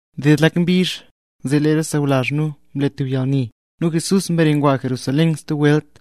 Mded lak mbizh, zee lee re sawlazh nu mle tub yalni, nu Jesús mbare ngwa Jerusalén stub welt.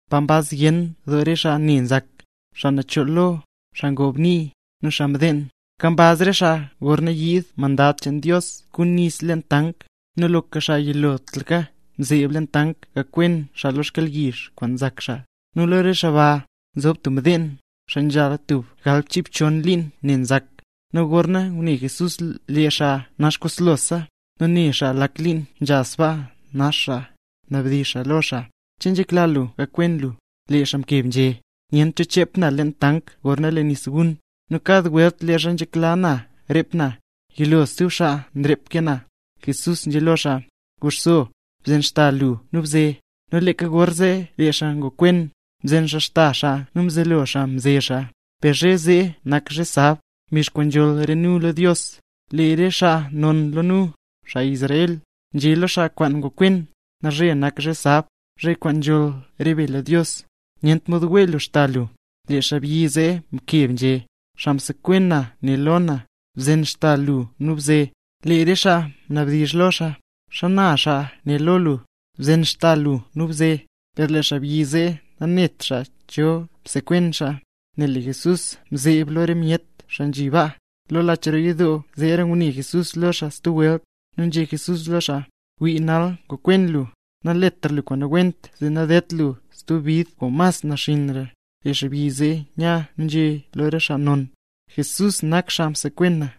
pa nkambaz zyen doo re xaa ne nzak: xaa nachool lo, xaa ngob nii, nu xaa mdeen. Nkambaz re xaa gorna yiid mandad cheen Dios kun nis leen tank, nu loka xaa yilotlaka nzeeb leen tank gakwen xaa lo yalyizh kwaan nzak xaa. Nu lo re xaa ba, nzho tub mdeen, xaa nzhala tub galbchiibxon liin ne nzak. Nu gorna ngune Jesús lee xaa naxkoslosa, nu ne xaa lak liin nzha sbaa nax xaa, mnabdizh xaa lo xaa: —¿Che nzhekla lu gakwen lu? Lee xaa mkeb nzhé: —Nyent cho chep na leen tank gorna lee nis gun. Nu kad welt leezha nzhekla na rep na, yilo stub xaa nrep ke na. Jesús nzhé lo xaa: —Guxso, bzen xda lu nu bze. Nu leeka gorzee lee xaa ngokwen, mzen xaa xda xaa nu mzelo xaa mze xaa. Per zhe zee nak zhe sab, mbizh kwaan nzholl re nu lo Dios. Lee re xaa non lo nu, xaa Israel, nzhé lo xaa kwaan ngokwen: —Nalzhe nak zhe sab, zhe kwaan nzholl re be lo Dios; nyent mod wee lu xda lu. Lee xaabyi zee mkeb nzhé: —Xaa msekwen na né lo na: “Bzen xda lu nu bze”. Lee re xaa mnabdizh lo xaa: —¿Xana xaa né lo lu: “Bzen xda lu nu bze”? Per lee xaabyi zee nanet xaa cho msekwen xaa, nel lee Jesús mzeeb lo re myet xaa nzhi baa. Lo lach roo yidoo zeera ngune Jesús lo xaa stub welt, zee nzhé Jesús lo xaa: —Wii, nal ngokwen lu; naletra lu kwaan nawent zee nadedt lu stub bid kwaan mas naxinnra. Lee xaabyi zee nya nu nzhé lo re xaa non: —Jesús nak xaa kwaan msekwen na.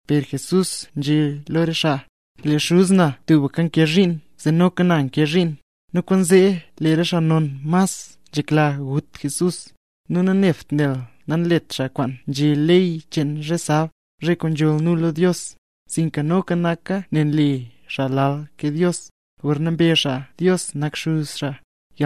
Per Jesús nzhé lo re xaa: —Lee Xuz na tubka nkee zhiin zee noka na nkee zhiin. Nu kwaanzee lee re xaa non mas nzhekla gut Jesús, nu nanebt nel nanlet xaa kwaan nzhé ley cheen zhe sab, zhe kwaan nzholl nu Dios, sinka noka naka nel nle xaa lal ke Dios, gorna mbezh xaa Dios nak Xuz xaa.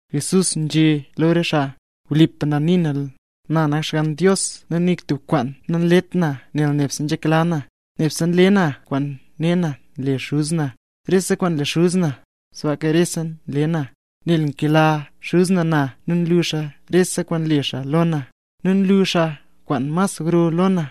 Jesús nzhé lo re xaa: —Wlipa na nii na, na nak Xgann Dios nu nik tub kwaan nanlet na nel nebse nzhekla na; nebse nle na kwaan ne na nle Xuz na. Rese kwaan nle Xuz na, sbaaka rese nle na. Nel nkela Xuz na na nu nlu xaa rese kwaan nle xaa lo na, nu luu xaa kwaan mas gro lo na,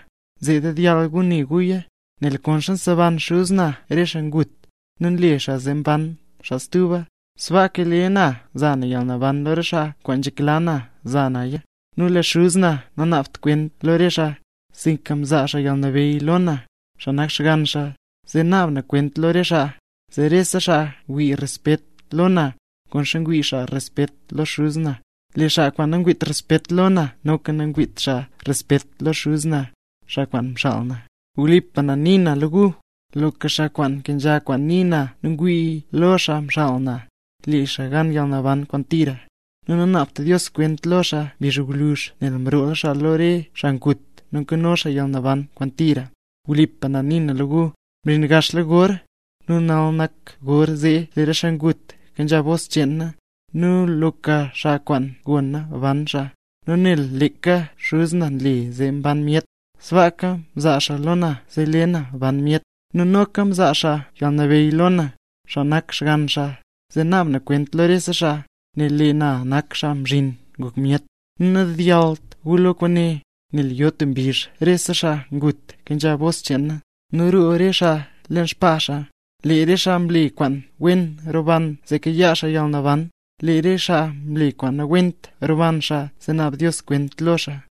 zee dedyall gu ne guya. Nel konxa nseban Xuz na re xaa ngut, nu nle xaa zee mban xaa stuba, sbaaka lee na nza yalnaban lo re xaa kwaan nzhekla na za naya. Nu lee Xuz na nanaabt kwent lo re xaa, sinka mzaa xaa yalnabeyy lo na, xaa nak Xgann xaa, zee naab na kwent lo re xaa, zee rese xaa wii respet lo na, konxa ngwii xaa respet lo Xuz na. Lee xaa kwaan nangwiit respet lo na, noka nangwiit xaa respet lo Xuz na, xaa kwaan mxaal na. ’Wlipa na nii na lo gu, loka xaa kwaan nkenzha kwaan nii na nu ngwii lo xaa mxaal na, le xaa gan yalnaban kwaan tira; nu nanaabt Dios kwent lo xaa mbizh gwluzh, nel mroola xaa lo re xaa ngut nu nkano xaa yalnaban kwaan tira. Wlipa na nii na lo gu, mzhin gaxla gor, nu nal nak gor zee lee re xaa ngut nkenzha bos cheen na, nu loka xaa kwaan gona ban xaa. Nu nel leeka Xuz na nle zee mban myet, sbaaka mzaa xaa lo na zee le na ban myet; nu noka mzaa xaa yalnabeyy lo na, xaa nak Xgann xaa, zee naab na kwent lo rese xaa, nel lee na nak Xaa Mzhin Ngok Myet. Nu nadedyallt gu lo kwaane, nel yo tub mbizh rese xaa ngut kenzha bos cheen na, nu roo re xaa leen xbaa xaa. Lee re xaa mle kwaan wen roban zee kayaa xaa yalnaban; lee re xaa mle kwaan nawent roban xaa zee naab Dios kwent lo xaa.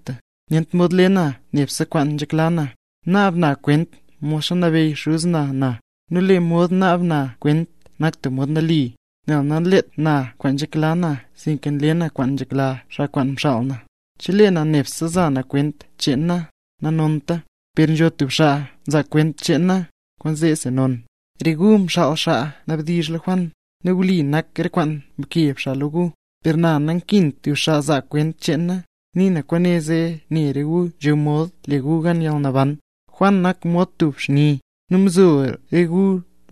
’Nyent mod le na nebse kwaan nzhekla na. Naab na kwent mod nabeyy Xuz na na, nu lee mod naab na kwent nak tub mod nali, nel nanlet na kwaan nzhekla na sinka nle na kwaan nzhekla xaa kwaan mxaal na. Chelee na nebse za na kwent cheen na, nanonta. Per nzho tub xaa nzaa kwent cheen na, kwent zeesi non. Re gu mxaal xaa nabdizh xaa lo Juan, nu wli nak re kwaan mkeb xaa lo gu. Per na nankint tub xaa zaa kwent cheen na, nii na kwaane zee ne re gu nzho mod le gu gan yalnaban. Juan nak mod tub xni, nu mzo re gu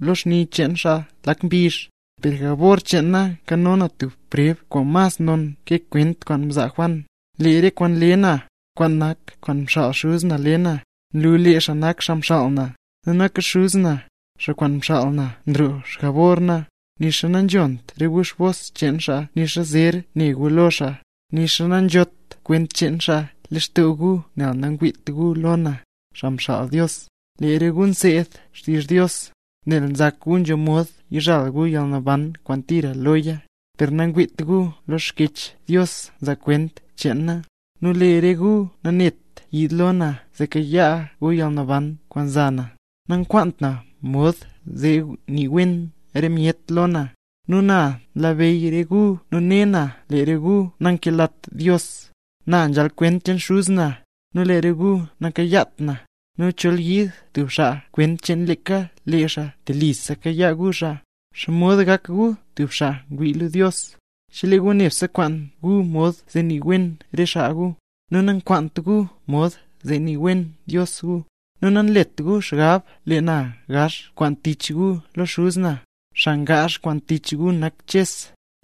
lo xni cheen xaa lak mbizh. Per jabor cheen na nkano na tub preb kwaan mas non ke kwent kwaan mzaa Juan. Lee re kwaan nle na, kwaan nak kwaan mxaal Xuz na le na, nlu lee xaa nak xaa mxaal na. Nu noka Xuz na, xaa kwaan mxaal na nroo xjabor na, nixa nanzhont re gu bos cheen xaa nixa zer ne gu lo xaa, nixa nanzhot kwent cheen xaa lextoo gu nel nangwiit gu lo na, xaa mxaal Dios. Lee re gu nseed xtizh Dios, nel nzak gu nzho mod yizhal gu yalnaban kwaan tira loya, per nangwiit gu lee Xkyech Dios nzaa kwent cheen na, nu lee re gu nanet yiid lo na zee kayaa gu yalnaban kwaan nza na. ’Nankwaant na mod zee nii wen re myet lo na. Nu na nlabeyy re gu nu ne na lee re gu nankelat Dios. Na nzhal kwent cheen Xuz na, nu lee re gu nakayaat na; nu chol yiid stub xaa kwent cheen leeka lee xaa, telisa kayaa gu xaa. ¿Xomod gak gu tub xaa ngwii lo Dios, chelee gu nebse nkwaan gu mod zee nii wen re xaa gu, nu nankwaant gu mod zee nii wen Dios gu? Nu nanlet gu xgab lee na gaazh kwaan tich gu lo Xuz na, xaa ngaazh kwaan tich gu nak Ches,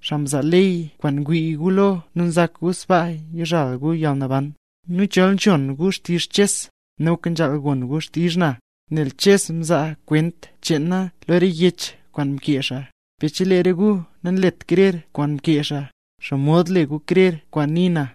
xaa mzaa ley kwaan ngwii gu lo nu nzak gu sbaa yizhal gu yalnaban. Nu chol nzhon gu xtizh Ches, noka nzhaal gon gu xtizh na, nel Ches mzaa kwent cheen na lo re yech kwaan mkee xaa. Per chelee re gu nanlet krer kwaan mkee xaa, ¿xomod le gu krer kwaan nii na?